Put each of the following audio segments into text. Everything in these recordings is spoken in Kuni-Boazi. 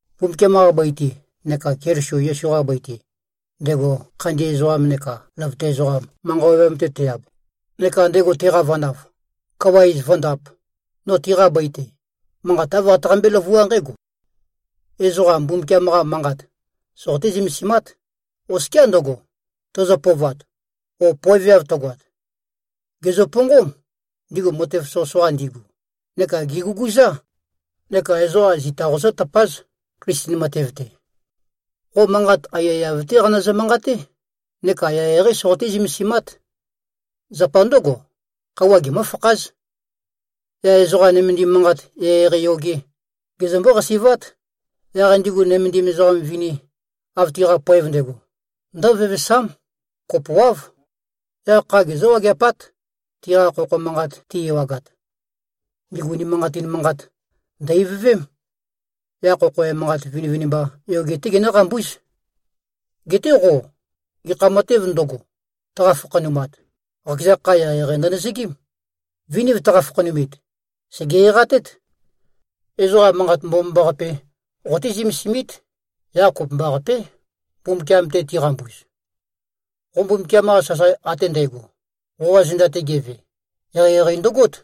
Mbumbukiam-qa bøi-te neka Keliso Yesu-qa bøi-te, ndego khandi ezoqam neka løvøte ezoqam manqa ovøyam-te te-ab, neka ndego teqavanav, kawa iz vǿndāp, no tiqa bøi-te, manqat āv qataqambé-løvuá nqǽgo: Ezoqa Mbumbukiam-qa manqat soqoté-zømesimát, oskiá ndøgo, tøzø-pøovat o poeveav tøgoat. Gèzøponqóm, ndigu matev soqøsoqa ndigu, neka gèguguzá. Neka ezoqa zita qozǿtøpáz, Klisten matev-te. Qo manqat aiyaiyav-té qanøzø-manqaté neka eqeieqeí soqoté-zømesimát. Zapa ndǿgo, khøuwa gemǿfakház. Yaq ezoqa nømendim manqat eqeieqei yoge, gezømbó-qasi꞉vát. Yaq ndigu nømendim ezoqa vini, av tiqa poev ndægo, ndǿvevesám. Kopoáv. Yaq kha gezǿ-wageapát, tiqa khokho manqat ti-ewagat. Ndigu unimanqatin manqat, ndø̀-ivøvém. Yaq khokho emanqat vinivinimba yoge-té ginǿqambúz. Geté qo, gekha matēv ndøgo, tøqa-fakhanumat, qakeza kha eqeieqei ndønøzøgím. Viniv tøqa-fakhanumit, sège-eqatét. Ezoqa Manqat Mbomambaqape qoté-zømesimít, yaq kopømbaqapé, Mbumbukiam-te tiqambuz. Qo Mbumbukiam-qa sasae ate ndægo, qoqa zenda-te geve, eqeieqei ndøgót.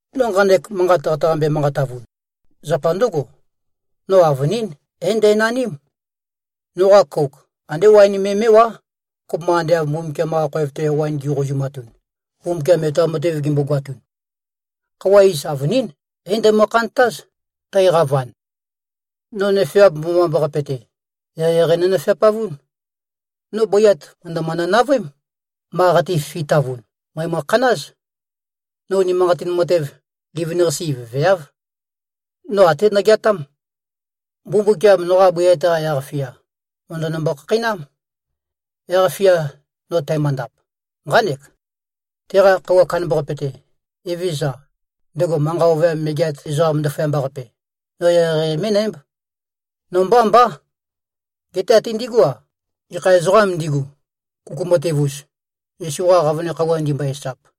No nqanek manqat qataqambe-manqatavun, zapa ndǿgo: No avønín é-ndænaním. Noqa kouk andé waen me mé꞉wá, kopømba ande av Mbumbukiam-qa khoev-te waen gi꞉qouzumatun, Mbumbukiam etoam matev gimbogoatun. Khøuwa iz avønín, é-ndæmø-khantáz, tæqavan. No nøfeap mbomambaqape-te, eqeieqei nonøfeapavún. No bøiyat mø̀ndømønø-navøém. Ma qate-fifitavun, mø̀emø-khanáz. No unimanqatin matev, livin-qase ivøveáv. No até nogeatám. Mbumbukiam noqa bøiyat-qa yaq-fia, mø̀ndønømbo-khakheinám. Yaq-fia no tæmøndap, nqánek: Teqa Khøuwa Kandambaqape-te, Evezøza, ndego manqa ovøyam megeat ezoqam ndaføyamba-qape, no eqeieqei mé꞉nǽmb. No mbá mbá, geté até ndigú-a, gekha ezoqām ndigu, kuku matev-us, Yesu-qa qavøne khøuwa ndimbøe-esap.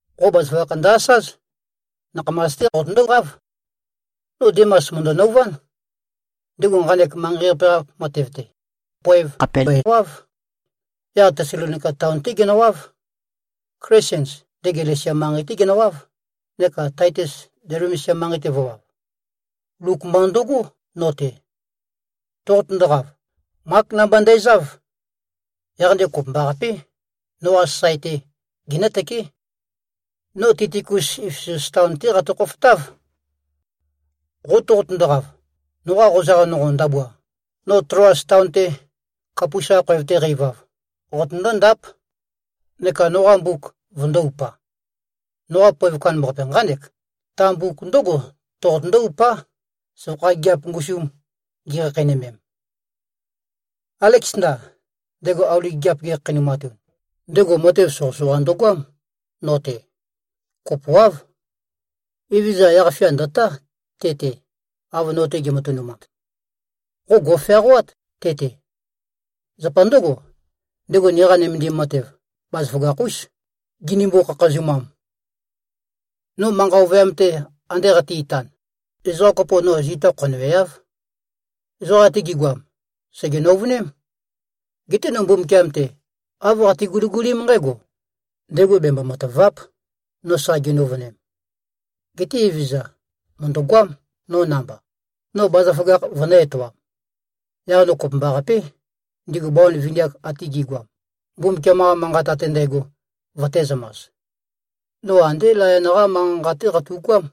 Qo bazaføgakh ndø-asáz. Nakhamas-té qotøndóqáv. No Dimas mø̀ndø-nøuván. Ndego nqanek manqei-qape-qa matev-te, poev khàpe mbøewáv. Yaq Tesalonika taon-té genøwáv. Klesens, ndego Galesia manqei-té genøwáv, neka Taitus Dalmesia manqei-te vø̄wav. Luk mba ndøgó, no-te. Toqotøndoqav, Mák namba ndæzáv. Yaq ndego kopømbaqapé, noqa sasae-te genǿtøké. No Tikikus Efesus taon-té qatø-khofotáv. Qo toqotøndoqav, noqa qozaq nonqo ndabua, no Tloas taon-te, Kapus-qa khoev-te qæ-ivav, qotøndó-ndáp. Neka noqa mbuk vøndō-upa. Noqa poev kandambaqape nqánek: Ta mbuk ndǿgo toqotøndó-upá, søvakha gigiap ngusum gi꞉khakheinømem. Aleksanda, ndego auli gigiap gekhakheinumatun, ndego matev soqøsoqa ndøgoám, no-te. Kopoáv. Evezøza yaq-fia ndø̀tá te-te, av no-te ge꞉matønumat. Qo gò꞉feaqoát te-te. Zapa ndǿgo, ndego niqa nømendim matev bazaføgakh-ús, ginimbo-khakhazumam. No manqa ovøyam-te ande qate-itan, ezoqa kopo no zita khonøweáv. Ezoqa ate gi꞉goam, sège-nøuvøném. Geté no Mbumbukiam-te, āv qate-guligulím nqǽgo: Ndego bembo-matàva᷄p, no sa ginøuvønem. Geté Evezøza mø̀ndøgoám, no namba, no bazaføgakh vønø̄-etoam. Yaq no kopømbaqapé, ndigu bawan vini-ak ate gi꞉goam, Mbumbukiam-qa Manqat ate ndægo vøtēzømas. No andé layon-qá manqa-nqa-té qatu꞉goám.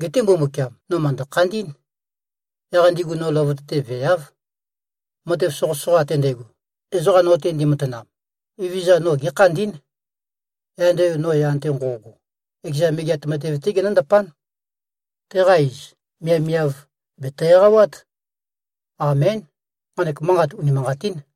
Geté Mbumbukiam, no mø̀ndø-khandí꞉n. Yaq ndigu no løvøte-te veeáv. Matev soqøsoqa ate ndægo, ezoqa no-te ndimatanam, Evezøza no gékhandí꞉n. Yaq ndego no yan-te nqo꞉go, ekeza Megeat Matev-té genǿndapán. Teqa iz, miavmiav, bèto-eqawát. Amén. Nqanek manqat unimanqatín!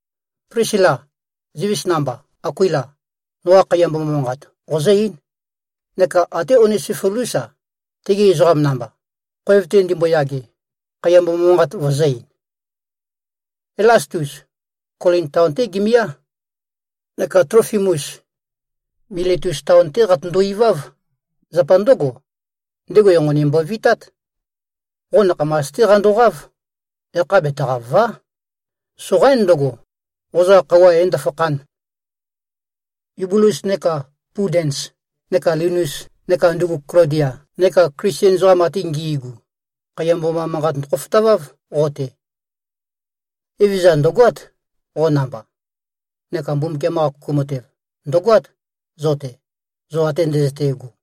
Plisila, zivis namba, Akuila, noqa khaiya mboma manqat qozǿ-eín, neka até Onesifolús-a, tegi ezoqam namba, khoev-te ndimboyage, khaiya mboma manqat vøzø̄-ein. Elastus, Kolin taon-té gemiá. Neka Tlofimus, Miletus taon-té qatøndo-iváv. Zapa ndǿgo, ndego enqoni mbovitát. Qo nakhamas-té qandoqáv. Yakha betaqàva᷄. Soqaín ndøgo, qozaq khøuwa ē-ndøfakhān. Yubulus neka Pudens neka Linus neka ndugu Klodia neka Klisten ezoqam ate ngi꞉gu, khaiya mboma manqat ndøkhofotaváv qo-te. Evezøza ndø̀goát, qo namba. Neka Mbumbukiam-qa kuku matev, ndø̀goát zo-te, zo ate ndøzøte꞉go.